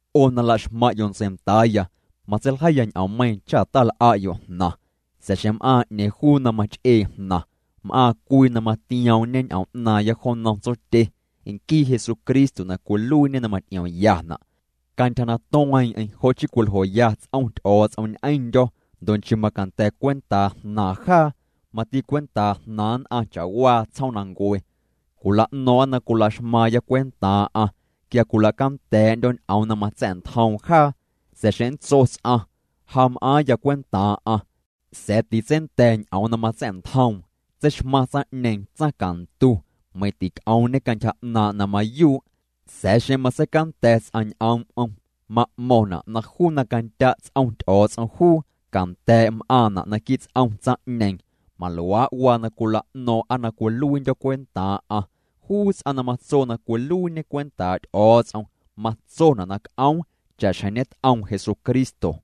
'O na laxmaⁿ'yo' ntseindaaya, matseiljeiya ñ'oommeiiⁿ cha' tal'a'yo' jnaⁿ, sa̱a̱ xeⁿ m'aaⁿ 'neeⁿ juu na mach'ee jnaⁿ, m'aaⁿ cwii na matioom'ñe ñ'oom 'naaⁿya jo nnom Tsotye, nquii Jesucristo na cwiluiiñe na maty'iomyana'. Cantyja na tueeⁿ'eⁿ jo' chii cwiljoya ts'om Ty'o̱o̱ts'om ñ'eⁿndyo̱ ndo' nchii macanda̱ cwentaa jnaaⁿ jaa, mati cwentaa jnaaⁿ nn'aⁿ cha'waa tsjoomnancue. Cwila'no̱o̱ⁿ'a na cwila'xmaaⁿya cwentaaⁿ'aⁿ quia cwila'canda̱a̱'ndyo̱ ñ'oom na matsa̱'ntjoom jaa. Sa̱a̱ xeⁿ nntso ts'aⁿ: “Ja mam'aaⁿya cwentaaⁿ'aⁿ”, sa̱a̱ titseinda̱ ñ'oom na matsa̱'ntjoom, tseixmaⁿ tsaⁿ'ñeeⁿ tsaⁿcantu meiⁿ tic'oomñe cantyja 'naaⁿ' na mayuu'. Sa̱a̱ xeⁿ matseicanda̱ ts'aⁿ ñ'oom'm ma'mo̱ⁿna' na juu na candya' ts'om Ty'o̱o̱ts'om juu, canda̱a̱' m'aaⁿna' naquii' ts'om tsaⁿ'ñeeⁿ maluaa' waa na cwila'no̱o̱ⁿ'a na cwiluiindyo̱ cwentaaⁿ'aⁿ. Juu ts'aⁿ na matso na cwiluiiñe cwentaa' Ty'o̱o̱ts'om, matsona' na c'oom cha'xjeⁿ ñet'oom Jesucristo.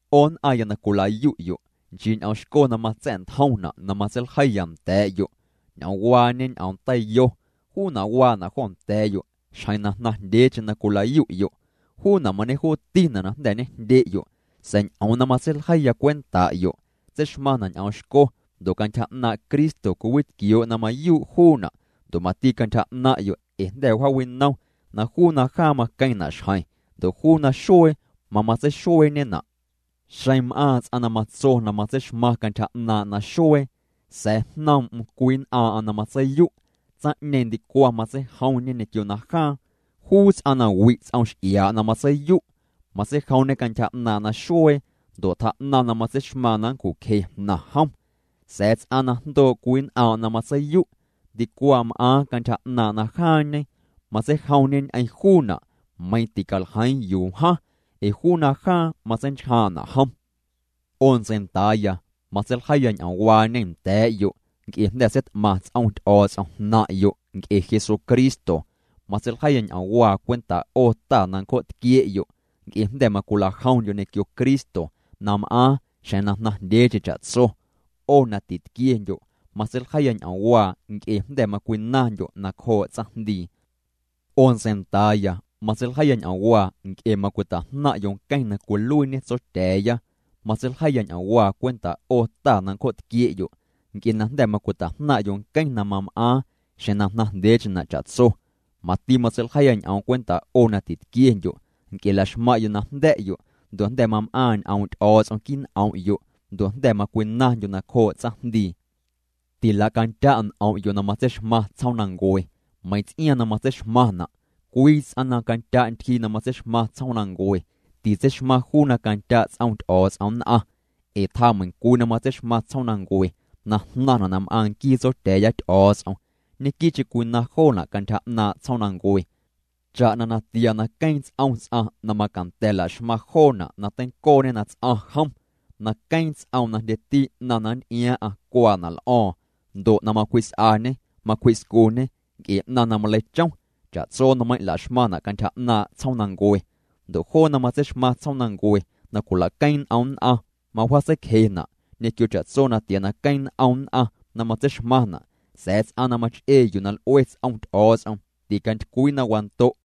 'O nn'aⁿya na cwila'yu'yo', nchii ñ'oom xco na matsa̱'ntjomna' na matseiljeiya nda̱a̱'yo', ñ'oomwaañe ñ'oom teiyo, juuna' waana' jo nda̱a̱'yo' xjeⁿ na jnaⁿ jndyeecheⁿ na cwila'yu'yo'. Juuna' mañejuutina' na jnda̱ ñejndye'yo'. Sa̱a̱ ñ'oom na matseiljeiya cwenta'yo' tseixmaⁿna' ñ'oom xco ndo' cantyja 'naaⁿ' Cristo cwiwitquioo' na mayuu' juuna' ndo' mati cantyja 'naⁿ'yo' ee jnda̱ wjaawinom na juu najaaⁿ maqueⁿna' xjeⁿ ndo' juu naxuee mamatseixueeñena'. Xeⁿ m'aaⁿ ts'aⁿ na tso na matseixmaaⁿ cantyja 'naaⁿ' naxuee, sa̱a̱ jnoom'm cwii nn'aaⁿ'aⁿ na matseiyu', tsaⁿ'ñeeⁿ ndicwaⁿ matseijomñe ñequio najaaⁿ. Juu ts'aⁿ na wi' ts'om x'iaa' na matseiyu', matseijomñe cantyja 'naaⁿ' naxuee ndo' tjaa'naⁿ na matseixmaaⁿ na nncju'cje jnaⁿ jom. Sa̱a̱ ts'aⁿ na jndoo' cwii nn'aaⁿ' na matseiyu' ndicwaⁿ m'aaⁿ cantyja 'naaⁿ' najaaⁿñe, matseijomñê ñ'eⁿ juuna', meiⁿ ticaljeiiⁿ yuu wjaⁿ, ee juu najaaⁿ matseinchjaaⁿ'na' jom. 'O ntseindaaya, matseiljeiya ñ'oomwaañe nda̱a̱'yo' nc'e jnda̱ seit'maⁿ ts'om Ty'o̱o̱ts'om jnaⁿ'yo' cwe' ee Jesucristo. Matseiljeiya ñ'oomwaa cwentaa' 'o ta na ncjo'tquie'yo' nc'e jnda̱ macwila'jomndyo' ñequio Cristo na m'aaⁿ xjeⁿ na jnaⁿjndyeecheⁿ cha'tso. 'O na titquiendyo' matseiljeiya ñ'oomwaa nc'e jnda̱ macwinaⁿndyo' nacjoo' tsaⁿjndii. 'O ntseindaaya, matseiljeiya ñ'oomwaa nc'e macwita'jnaⁿ'yo' nqueⁿ na cwiluiiñê Tsotya̱a̱ya. Matseiljeiya ñ'oomwaa cwenta' 'o ta na ncjo'tquie'yo' nc'e jnda̱ macwita'jnaⁿ'yo' nqueⁿ na mam'aaⁿ xjeⁿ na jnaⁿjndyeecheⁿna' cha'tso. Mati matseiljeiya ñ'oom cwenta' 'o na titquiendyo' nc'e laxmaⁿ'yo' na jnda̱'yo' ndo' jnda̱ mam'aaⁿ ñ'oom' Ty'o̱o̱ts'om quii' n'om'yo' ndo' jnda̱ macwinaⁿndyo' nacjoo' tsaⁿjndii. Tilacandya' n'om'yo' na matseixmaⁿ tsjoomnancue meiⁿ ts'iaaⁿ na matseixmaⁿna'. Cwii ts'aⁿ na candya' ntyjii na matseixmaⁿ tsjoomnancue, titseixmaaⁿ juu na candya' ts'om Ty'o̱o̱ts'om nn'aⁿ. Ee tjaameiⁿcwii na matseixmaⁿ tsjoomnancue na jnaⁿna' na m'aaⁿ nquii Tsotya̱a̱ya Ty'o̱o̱ts'om, ñequii'cheⁿ cwinaⁿ joona' cantyja 'naaⁿ' tsjoomnancue, cha'na natia na queeⁿ ts'om ts'aⁿ na macanda̱ laxmaⁿ joona' na teincooñê na ts'aⁿ jnaⁿ jom, na queeⁿ ts'oom na jndyeti 'naⁿ na nty'iaaⁿ'aⁿ cuaana' l'o̱o̱ⁿ, ndo' na macwji's'añê macwji'scuñê nc'e 'naⁿ na maleichom. Cha'tso nmeiiⁿ' laxmaⁿna' cantyja 'naaⁿ' tsjoomnancue. Ndo' joo na matseixmaⁿ tsjoomnancue na cwilaqueeⁿ n'om nn'aⁿ, mawjaatseicjena', ñequio cha'tso natia na queeⁿ n'om nn'aⁿ na matseixmaⁿna'. Sa̱a̱ ts'aⁿ na mach'ee yuu na l'ue ts'om Ty'o̱o̱ts'om, ticantycwii na wando'.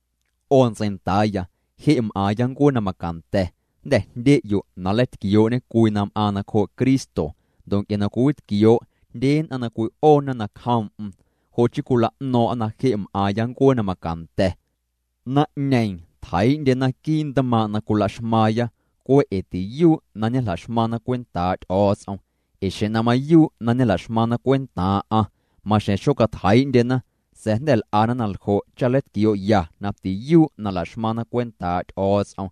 'O ntseindaaya, je' m'aaⁿya ncuee na macanda̱. Jnda̱ jndye'yo' na nleitquioo'ñe cwii na m'aaⁿ nacjoo' Cristo, ndo' nc'e na cwiwitquioo' jndye nn'aⁿ na cwi'oona nacjoom'm jo' chii cwila'no̱o̱ⁿ'a na je' m'aaⁿya ncuee na macanda̱. Naⁿ'ñeeⁿ tjeii'ndyena quii' ntmaaⁿ' na cwila'xmaaⁿya cwe' ee tiyuu' na ñejla'xmaⁿna cwentaa' Ty'o̱o̱ts'om. Ee xeⁿ na mayuu' na ñejla'xmaⁿna cwentaaⁿ'aⁿ, maxjeⁿ xocatjeii'ndyena. Sa̱a̱ jnda̱ l'ana na ljo' cha nleitquioo'ya na tiyuu' na la'xmaⁿna cwentaa' Ty'o̱o̱ts'om.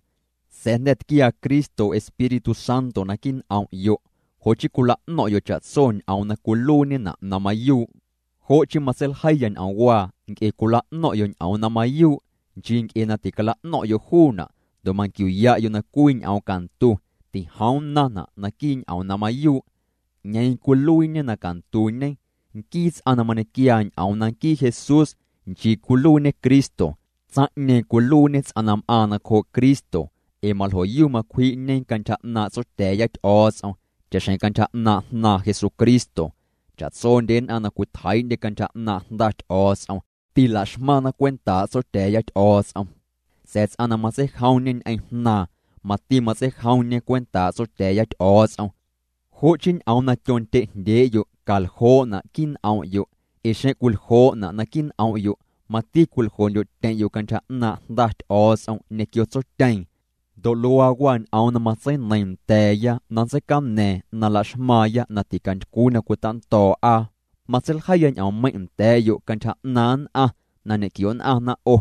Sa̱a̱ jnda̱ tquiaa Cristo Espíritu Santo naquii' n'om'yo'. Jo' chii cwila'no̱ⁿ'yo' cha'tso ñ'oom na cwiluiiñena' na mayuu'. Jo' chii matseiljeiya ñ'oomwaa nc'e cwila'no̱ⁿ'yo' ñ'oom na mayuu', nchii nc'e na ticala'no̱ⁿ'yo' juuna', ndo' manquiu'ya'yo' na cwii ñ'oom cantu tijoom nnaⁿna' naquii' ñ'oom na mayuu'. ¿'Ñeeⁿ juu cwiluiiñe na cantuñe? Nquii ts'aⁿ na mañequiaa ñ'oom na nquii Jesús nchii cwiluiiñê Cristo. Tsaⁿ'ñeeⁿ cwiluiiñe ts'aⁿ na m'aaⁿ nacjoo' Cristo ee maljo'yu macwji'ñe cantyja 'naaⁿ' Tsotya̱a̱ya Ty'o̱o̱ts'om cha'xjeⁿ cantyja 'naaⁿ' Jnaaⁿ Jesucristo. Cha'tsondye nn'aⁿ na cwitjeii'ndye cantyja 'naaⁿ' Jnda Ty'o̱o̱ts'om, tilaxmaⁿna cwentaa' Tsotya̱a̱ya Ty'o̱o̱ts'om, sa̱a̱ ts'aⁿ na matseijomñe ñ'eⁿ Jnaaⁿ, mati matseijomñe cwentaa' Tsotya̱a̱ya Ty'o̱o̱ts'om. Jo' chii ñ'oom na tyondye'jndyee'yo' caljoo'na' quii' n'om'yo' ee xeⁿ cwiljoo'na' naquii' n'om'yo', mati cwiljoo'ndyo'tyeⁿ'yo' cantyja 'naaⁿ' Jnda Ty'o̱o̱ts'om ñequio Tsotyeeⁿ. Ndo' luaa waa ñ'oom na matseineiiⁿ nda̱a̱ya na nntseicaña̱a̱ⁿ na laxmaaⁿya na ticantycwii na cwitando̱o̱'a. Matseiljeiya ñ'oommeiⁿ' nda̱a̱'yo' cantyja 'naaⁿ nn'aⁿ na ñe'quio'nn'aⁿna 'o.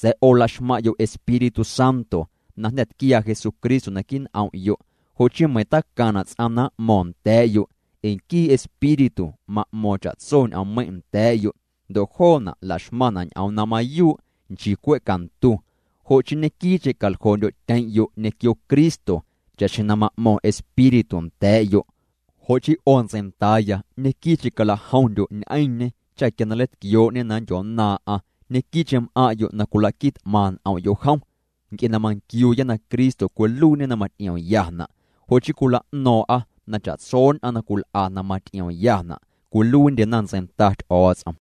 Sa̱a̱ 'o laxmaⁿ'yo' Espíritu Santo na jnda̱ tquiaa Jesucristo naquii' n'om'yo', jo' chii meiⁿ tacaⁿna' ts'aⁿ na m'mo̱ⁿ nda̱a̱'yo', ee nquii Espíritu ma'mo̱o̱ⁿ cha'tso ñ'oommeiⁿ' nda̱a̱'yo', ndo' joona' laxmaⁿna' ñ'oom na mayuu' nchii cwe' cantu. Jo' chii ñequii'cheⁿ calajomndyo'tyeⁿ'yo' ñequio Cristo cha'xjeⁿ na ma'mo̱ⁿ Espíritu nda̱a̱'yo'. Jo' chii 'o ntseindaaya, ñequii'cheⁿ calajomndyo' ñ'eⁿñê cha quia na nleitquioo'ñê na nndyonnaaⁿ'aⁿ, ñequii'cheⁿ m'aⁿ'yo' na cwila'qui t'maⁿ n'om'yo' jom. Nc'e na manquiuuya na Cristo cwiluiiñê na maty'iomyana', jo' chii cwila'no̱o̱ⁿ'a na cha'tso nn'aⁿ na cwil'a na maty'iomyana' cwiluiindyena ntseinda Ty'o̱o̱ts'om.